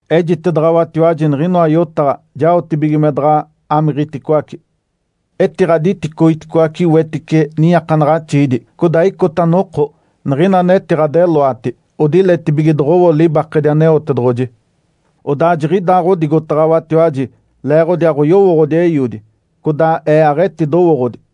Ejitedaɡ̶awatiwaji niɡ̶inoa yotaɡ̶a jaotibige me daɡ̶a amiɡ̶iticoace. Etiɡ̶aditicoiticoace wetice niiakanaɡ̶axiidi. Codaa icota noko, niɡ̶ina anetiɡ̶adeloati odiletibige doɡ̶owo libakedi Aneotedoɡ̶oji. Odaa jiɡ̶idaaɡ̶odigotaɡ̶awatiwaji leeɡ̶odi aɡ̶oyowooɡ̶odi Eiodi, codaa Ee aɡ̶etidowooɡ̶odi.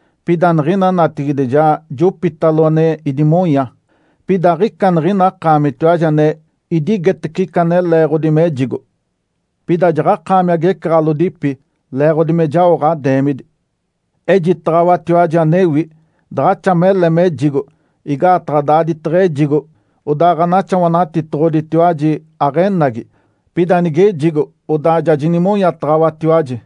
Pida niɡ̶ina natigide ja jopitalo ane idimonya. Pida aɡ̶ica niɡ̶ina akaamitiwaji ane idigetece ica ane leeɡ̶odi mejigo. Pida jaɡ̶akaami agecaɡ̶alodipi leeɡ̶odi me jao ɡ̶adeemidi. Ejitaɡ̶awatiwaji anewi. Daɡ̶axa mele mejigo, igaataɡ̶a daaditaɡ̶a ejigo, odaa Ǥanaxawanatitoɡ̶oditiwaji aɡ̶enagi. Pida nigejigo odaa ja jinimonyataɡ̶awatiwaji.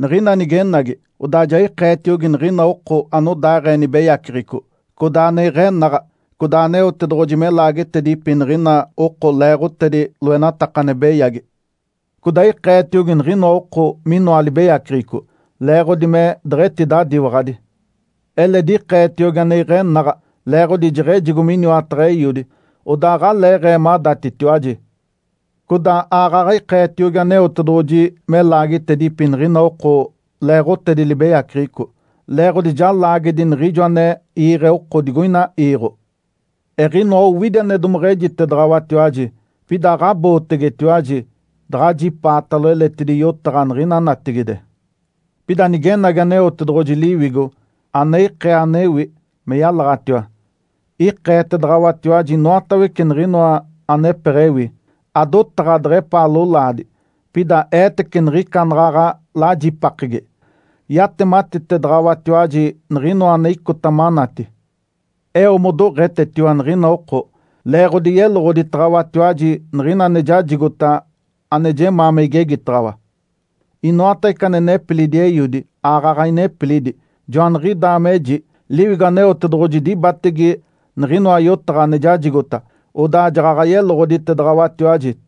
Niɡ̶ina nigenagi, odaa ja ikeetiogi niɡ̶ina oko anodaaɡ̶ee nibeyaceɡ̶eco, codaa ane iɡ̶enaɡ̶a, codaa Aneotedoɡ̶oji me laagetedipi niɡ̶ina oko leeɡ̶otedi loenataka ane beyagi. Codaa ikeetiogi niɡ̶ina oko minoa libeyaceɡ̶eco, leeɡ̶odi me deɡ̶etidadiwaɡ̶adi. Eledi ikeetiogi ane iɡ̶enaɡ̶a, leeɡ̶odi jeɡ̶ejigo miniwataɡ̶a Eiodi, odaa aɡ̶aleeɡ̶ee madatitiwaji. Codaa aaɡ̶aɡ̶a ikeetiogi Aneotedoɡ̶oji me laagetedipi niɡ̶ina oko leeɡ̶otedi libeyaceɡ̶eco, leeɡ̶odi ja laagedi niɡ̶ijo ane iiɡ̶e oko digoina iiɡ̶o. Eɡ̶inoa owidi ane domeɡ̶ejitedaɡ̶awatiwaji, pida aɡ̶abootegetiwaji daɡ̶ajipaatalo eletidi yotaɡ̶a niɡ̶ina natigide. Pida nigenagi Aneotedoɡ̶oji Liwigo, ane ikee anewi me yalaɡ̶atiwa, ikeetedaɡ̶awatiwaji inoatawece niɡ̶inoa anepeɡ̶ewi. Adotaɡ̶a deɡ̶epaa lolaadi, pida eetece niɡ̶ica anaɡ̶aɡ̶a lajipakegi. Yatematitedaɡ̶awatiwaji niɡ̶inoa ane icota manati. Eo modoɡ̶etetiwa niɡ̶ina oko, leeɡ̶odi yeloɡ̶oditaɡ̶awatiwaji niɡ̶ina ane jajigota, ane jemaa me igegitaɡ̶awa. Inoatawece ane nepilidi Eiodi, aaɡ̶aɡ̶a inepilidi. Joaniɡ̶idaa meji, Liwigo Aneotedoɡ̶oji dibatege niɡ̶inoa yotaɡ̶a ane jajigota, odaa jaɡ̶aɡ̶a yeloɡ̶oditedaɡ̶awatiwaji.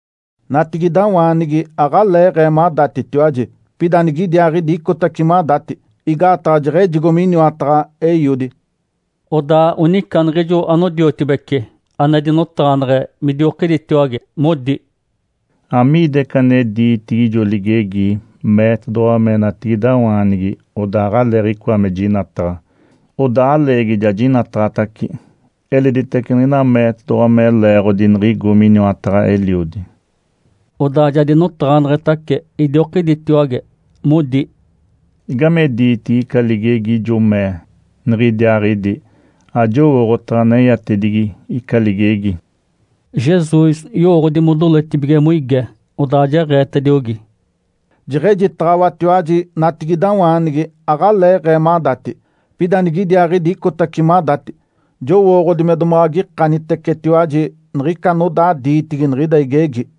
Natigidawaanigi aɡ̶aleeɡ̶ee madatitiwaji. Pida nigidiaaɡ̶idi icotace madati. Igaataɡ̶a jeɡ̶ejigo miniwataɡ̶a Eiodi”. Odaa onica niɡ̶ijo anodiotibece ane dinotaɡ̶aneɡ̶e midiokiditiwage, modi, “Amiida ica ane diitigi ijo ligegi meetedoɡ̶owa me natigidawaanigi odaa aɡ̶aleeɡ̶icoa me jinataɡ̶a, odaa aleegi ja jinataɡ̶atace, eleditace niɡ̶ina meetedoɡ̶owa me leeɡ̶odi niɡ̶igo miniwataɡ̶a Eliodi?” Odaa ja dinotaɡ̶aneɡ̶etace idiokiditiwage, modi, “Igame diitigi ica ligegi ijo mee, ‘Nigidiaaɡ̶idi’? Ajowooɡ̶otaɡ̶a aneyatedigi ica ligegi”. Jesus yowooɡ̶odi modoletibige moige, odaa jeɡ̶eetediogi, “Jeɡ̶ejitaɡ̶awatiwaji natigidawaanigi aɡ̶aleeɡ̶ee madati, pida nigidiaaɡ̶idi icotace madati. Jowooɡ̶odi me domaɡ̶a agikanitecetiwaji niɡ̶ica anodaa diitigi niɡ̶ida igegi.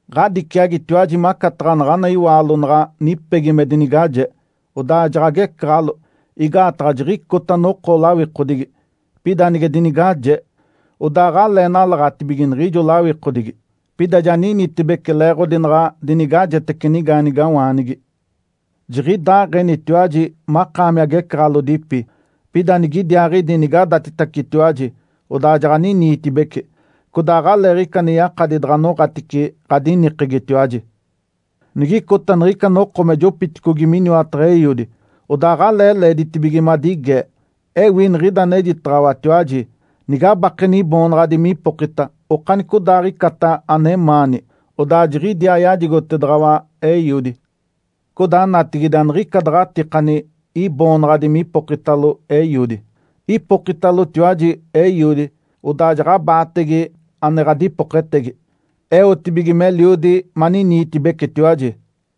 Ǥadiciagitiwaji macataɡ̶a naɡ̶ana iwaalo naɡ̶a nipegi me dinigaje, odaa jaɡ̶agecaɡ̶alo, igaataɡ̶a jiɡ̶icota noko lawikodigi. Pida nige dinigaje, odaa aɡ̶alee nalaɡ̶atibige niɡ̶ijo lawikodigi. Pida ja ninitibece leeɡ̶odi naɡ̶a dinigajetece nigaanigawaanigi. Jiɡ̶idaaɡ̶enitiwaji makaami agecaɡ̶alodipi. Pida nigidiaaɡ̶idi nigadatitacitiwaji, odaa jaɡ̶aniniitibeci. Codaa aɡ̶aleeɡ̶ica ane yakadi daɡ̶a noɡ̶atice ɡ̶adinikegitiwaji. Nigicota niɡ̶ica noko me jopiticogi miniwataɡ̶a Eiodi, odaa aɡ̶alee leeditibige madigee. Ewi niɡ̶ida anejitaɡ̶awatiwaji. Nigabakeni Iboonaɡ̶adi mipokita okanicodaaɡ̶icata anemaani, odaa jiɡ̶idiaa yajigotedaɡ̶awa Eiodi. Codaa natigide aniɡ̶ica daɡ̶a atikani Iboonaɡ̶adi me ipokitalo Eiodi. Ipokitalotiwaji Eiodi, odaa jaɡ̶abaatege ane ɡ̶adipoketegi, eotedibige meliodi maniniitibecitiwaji.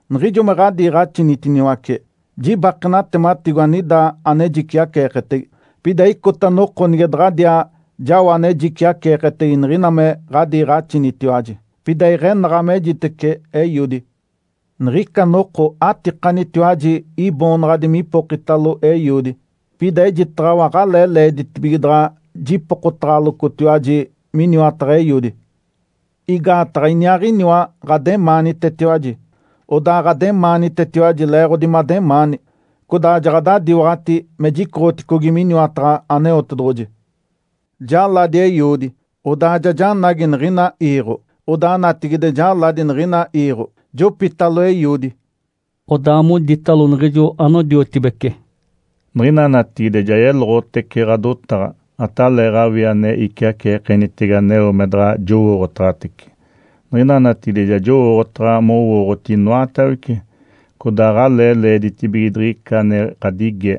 Niɡ̶ijo me ɡ̶adiiɡ̶axinitiniwace, jibake natematiko, anida ane jiciaceeketege. Pida icota noko nige daɡ̶adiaa jao ane jiciaceeketege niɡ̶ina me ɡ̶adiiɡ̶axinitiwaji, pida iɡ̶enaɡ̶a mejitece Eiodi. Niɡ̶ica noko atikanitiwaji Iboonaɡ̶adi me ipokitalo Eiodi. Pida ejitaɡ̶awa aɡ̶alee leeditibige daɡ̶a jipokotaɡ̶alocotiwaji miniwataɡ̶a Eiodi. Igaataɡ̶a Iniaaɡ̶iniwa ɡ̶ademaanitetiwaji. Odaa ɡ̶ademaanitetiwaji leeɡ̶odi mademaani, codaa jaɡ̶adadiwaɡ̶ati me jicoɡ̶oticogi miniwataɡ̶a Aneotedoɡ̶oji. Jaladi Eiodi, odaa ja janagi niɡ̶ina iiɡ̶o. Odaa natigide jaladi niɡ̶ina iiɡ̶o, jopitalo Eiodi”. Odaa moditalo niɡ̶ijo anodiotibece, “Niɡ̶ina natigide ja yeloɡ̶otece ɡ̶adotaɡ̶a, ataleeɡ̶awii ane iciaceekenitege aneo me daɡ̶a jowooɡ̶otaɡ̶atece. Niɡ̶ina natigide ja jowooɡ̶otaɡ̶a mowooɡ̶oti inoatawece, codaa aɡ̶alee leeditibige diɡ̶ica ane ɡ̶adigee.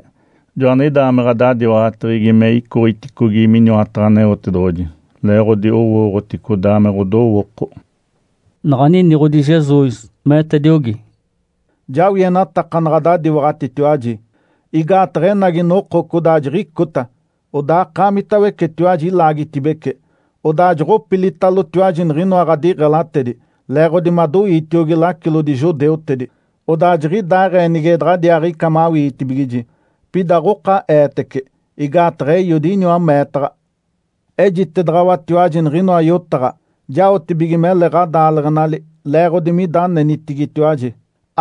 Joaniɡ̶idaa me ɡ̶adadiwaɡ̶ateɡ̶egi me icoɡ̶iticogi miniwataɡ̶a Aneotedoɡ̶oji (Leeɡ̶odi owooɡ̶oti codaa me ɡ̶odowooko)”. Naɡ̶a niniɡ̶odi Jesus, meetediogi, “Jawienataka naɡ̶a adadiwaɡ̶atitiwaji. Igaataɡ̶a enagi noko codaa jiɡ̶icota, odaa akaamitawecetiwaji ilaagitibece, odaa joɡ̶opilitalotiwaji niɡ̶inoa ɡ̶adiɡ̶elatedi, leeɡ̶odi madoiitiogi lacilodi judeutedi. Odaa jiɡ̶idaaɡ̶ee nige daɡ̶adiaaɡ̶ica mawitibigiji. Pida aɡ̶oka Eetece, igaataɡ̶a Eiodi iniwa meetaɡ̶a. Ejitedaɡ̶awatiwaji niɡ̶inoa yotaɡ̶a, jaotibige mele ɡ̶adaaleɡ̶enali leeɡ̶odi mida anenitigitiwaji.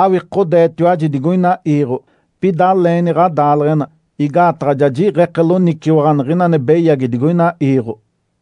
Awikodeetiwaji digoina iiɡ̶o, pida aleeni ɡ̶adaaleɡ̶ena, igaataɡ̶a ja jiɡ̶eke loniciwaɡ̶a niɡ̶ina ane beyagi digoina iiɡ̶o”.